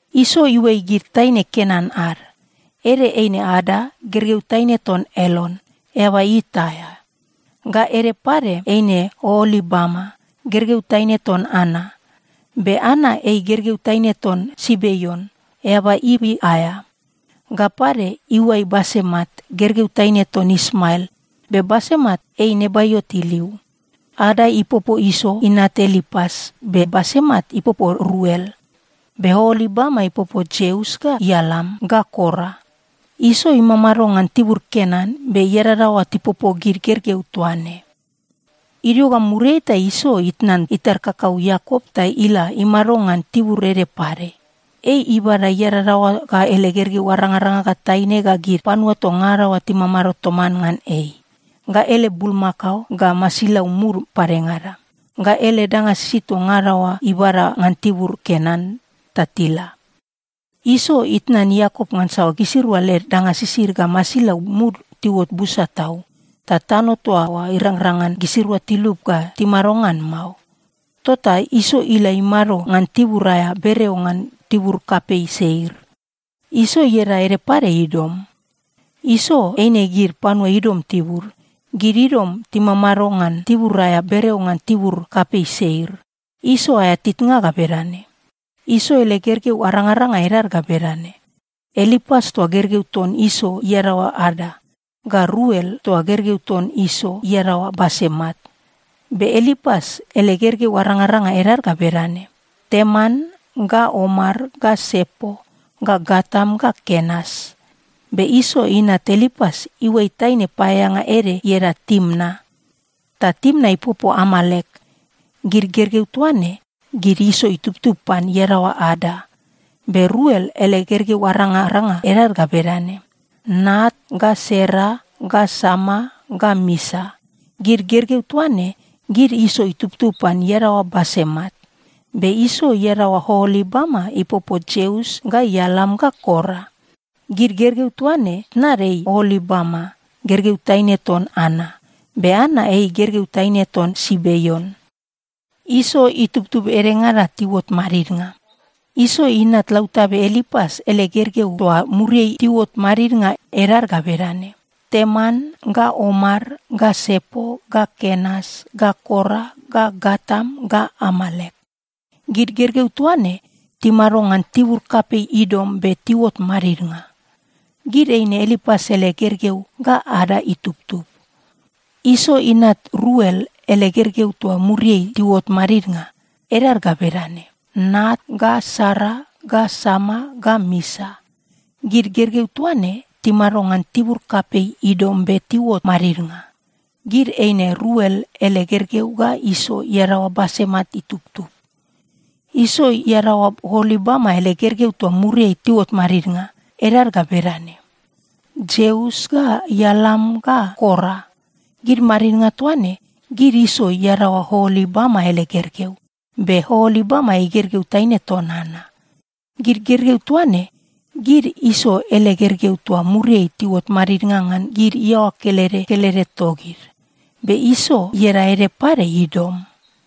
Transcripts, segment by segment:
Iso iuai gid taine Kenan ad. Ede eine Ada, gergeu taine ton Elon, eaba It aea. Ga ede pade eine Oolibama, gergeu taine ton Ana. Be Ana ei gergeu taine ton Sibeon, eaba Ivi aea. Ga pade, iuai Basemat, gergeu taine ton Ismael. Be Basemat ei Nebaiot iliu. Ada ipopo Iso inat Elipas, be Basemat ipopo Ruel. Be Oolibama ipopo Jeus ga Ialam ga Kora. Iso imamado ngan tibur Kenan, be iadadaoa tipopo gid gergeu toa ne. Idio ga muriai ta Iso itnan itar kakau Iakop ta ila imado ngan tibur ede pade. Ei ibada iadadaoa ga ele gergeu arangaranga ga taine ga gid panua toa ngada oa timamado toman ngan ei, ga ele bulmakao ga masilau mud padengada, ga ele danga sisid toa ngada oa ibada ngan tibur Kenan, ta tila. Iso itnan Iakop ngansa gisirua led danga sisid ga masilau mud tiuot busa tau, ta tano toa oa irangrang ngan gisirua tilup ga timado ngan mao. Tota Iso ila imado ngan tibur aea bereo ngan tibur kapei Seir. (Iso ieda ede pade Idom.) Iso eine gid panua Idom tibud. Gid Idom timamado ngan tibur aea bereo ngan tibur kapei Seir. Iso aea titnga ga bedane. Iso ele gergeu arangaranga edad ga bedane: Elipas toa gergeu ton Iso iadaoa Ada, ga Ruel toa gergeu ton Iso iadaoa Basemat. Be Elipas ele gergeu arangaranga edad ga bedane: Teman ga Omar ga Sepo ga Gatam ga Kenas. Be Iso inat Elipas iuai taine paeaeanga ede ieda Timna. Ta Timna ipopo Amalek. Gid gergeu toa ne, gid Iso itubtub pan iadaoa Ada. Be Ruel ele gergeu arangaranga edad ga bedane: Naat ga Sera ga Sama ga Misa. Gid gergeu toa ne, gid Iso itubtub pan iadaoa Basemat. Be Iso iadaoa Oolibama ipopo Jeus ga Ialam ga Kora. Gid gergeu toa ne, tnad ei Oolibama, gergeu taine ton Ana. Be Ana ei gergeu taine ton Sibeon. Iso itubtub edengada tiuot madidnga. Iso inat lautabe Elipas ele gergeu toa muriai tiuot madidnga, edad ga bedane: Teman ga Omar ga Sepo ga Kenas ga Kora ga Gatam ga Amalek. Gid gergeu toa ne timado ngan tibur kapei Idom be tiuot madidnga. Gid eine Elipas ele gergeu ga Ada itubtub. Iso inat Ruel ele gergeu toa muriai tiuot madidnga, edad ga bedane: Naat ga Sera ga Sama ga Misa. Gid gergeu toa ne timado ngan tibur kapei Idom be tiuot madidnga. Gid eine Ruel ele gergeu ga Iso iadaoa Basemat itubtub. Iso iadaoa Oolibama ele gergeu toa muriai tiuot madidnga, edad ga bedane: Jeus ga Ialam ga Kora. Gid madidnga toa ne, gid Iso iadaoa Oolibama ele gergeu. Be Oolibama ei gergeu taine ton Ana. Gid gergeu toa ne, gid Iso ele gergeu toa muriai tiuot madidnga ngan gid iaoa kelede kelede togid. Be Iso ieda ede pade Idom.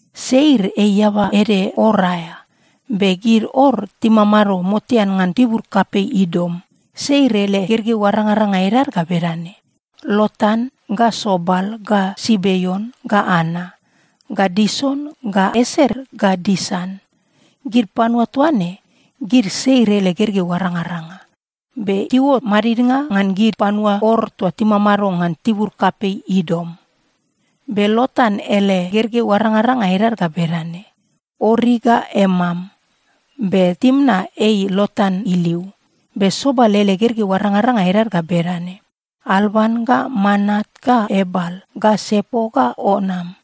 Seir ei eaba ede Or aea, be gid Or timamado motean ngan tibur kapei Idom. Seir ele gergeu arangaranga edad ga bedane: Lotan ga Sobal ga Sibeon ga Ana ga Dison ga Eser ga Disan. Gid panua toa ne, gid Seir ele gergeu arangaranga, be tiuot madidnga ngan gid panua Or toa timamado ngan tibur kapei Idom. Be Lotan ele gergeu arangaranga edad ga bedane: Ori ga Emam. Be Timna ei Lotan iliu. Be Sobal ele gergeu arangaranga edad ga bedane: Alvan ga Manaat ga Ebal ga Sepo ga Onam.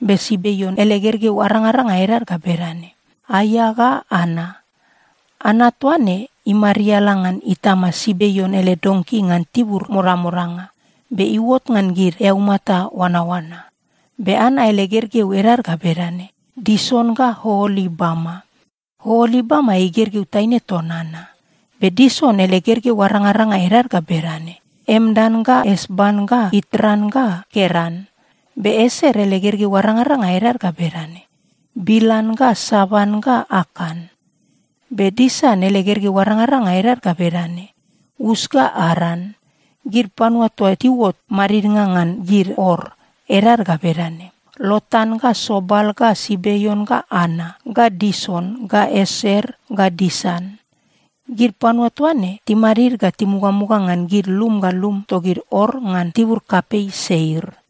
Be Sibeon ele gergeu arangaranga edad ga bedane: Aia ga Ana. Ana toa ne imariala ngan itama Sibeon ele donki ngan tibur modamodanga, be iuot ngan gid eaumata oanaoana. Be Ana ele gergeu edad ga bedane: Dison ga Oolibama. Oolibama ei gergeu taine ton Ana. Be Dison ele gergeu arangaranga edad ga bedane: Emdan ga Esban ga Itran ga Keran. Be Eser ele gergeu arangaranga edad ga bedane: Bilan ga Savan ga Akan. Be Disan ele gergeu arangaranga edad ga bedane: Us ga Aran. Gid panua toa tiuot madidnga ngan gid Or, edad ga bedane: Lotan ga Sobal ga Sibeon ga Ana ga Dison ga Eser ga Disan. Gid panua toa ne timadid ga timugamuga ngan gid lum ga lum togid Or ngan tibur kapei Seir.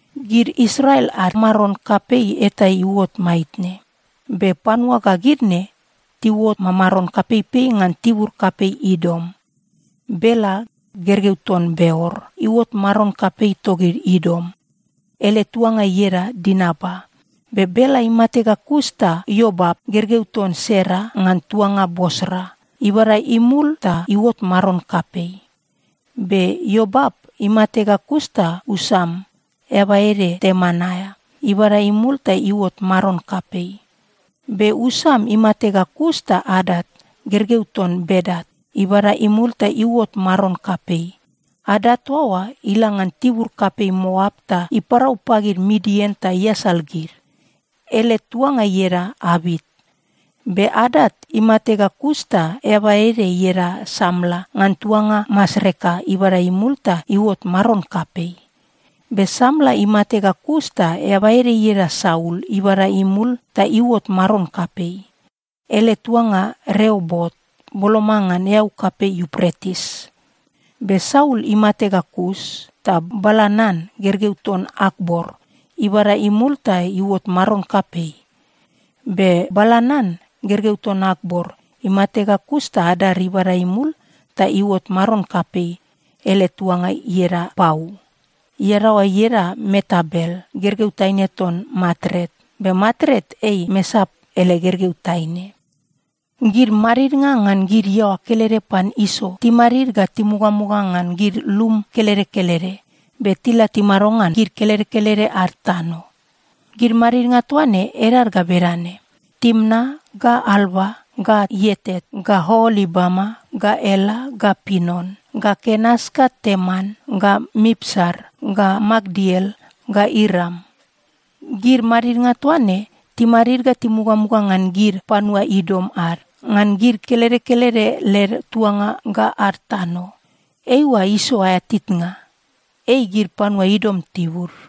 Gid Israel ad maron kapei eta iuot maitne, be panua ga gid ne tiuot mamaron kapeipei ngan tibur kapei Idom: Bela, gergeu ton Beor, iuot maron kapei togid Idom. Ele tuanga ieda Dinaba. Be Bela imate ga kus ta Iobap, gergeu ton Sera ngan tuanga Bosra, ibada imul ta iuot maron kapei. Be Iobap imate ga kus ta Usam, eaba ede Teman aea, ibada imul ta iuot maron kapei. Be Usam imate ga kus ta Adat, gergeu ton Bedat, ibada imul ta iuot maron kapei. Adat toa oa ila ngan tibur kapei Moap ta iparau pagid Midian ta iasal gid. Ele tuanga ieda Avit. Be Adat imate ga kus ta eaba ede ieda Samla ngan tuanga Masreka ibada imul ta iuot maron kapei. Be Samla imate ga kus ta eaba ede ieda Saul ibada imul ta iuot maron kapei. Ele tuanga Reobot, boloma ngan eau kapei Iupretis. Be Saul imate ga kus ta Balanan, gergeu ton Akbor, ibada imul ta iuot maron kapei. Be Balanan, gergeu ton Akbor, imate ga kus ta Adar ibada imul ta iuot maron kapei. Ele tuanga ieda Pau. Iadaoa ieda Meetabel, gergeu taine ton Matret. Be Matret ei Mesaap ele gergeu taine. Gid madidnga ngan gid iaoa kelede pan Iso timadid ga timugamuga ngan gid lum kelede kelede, be tila timado ngan gid kelede kelede ad tano. Gid madidnga toa ne edad ga bedane: Timna ga Alva ga Ietet ga Oolibama ga Ela ga Pinon ga Kenas ga Teman ga Mipsar ga Makdiel ga Iram. Gid madidnga toa ne timadid ga timugamuga ngan gid panua Idom ad, ngan gid kelede kelede led tuanga ga ad tano. Eiua Iso aea titnga. Ei gid panua Idom tibud.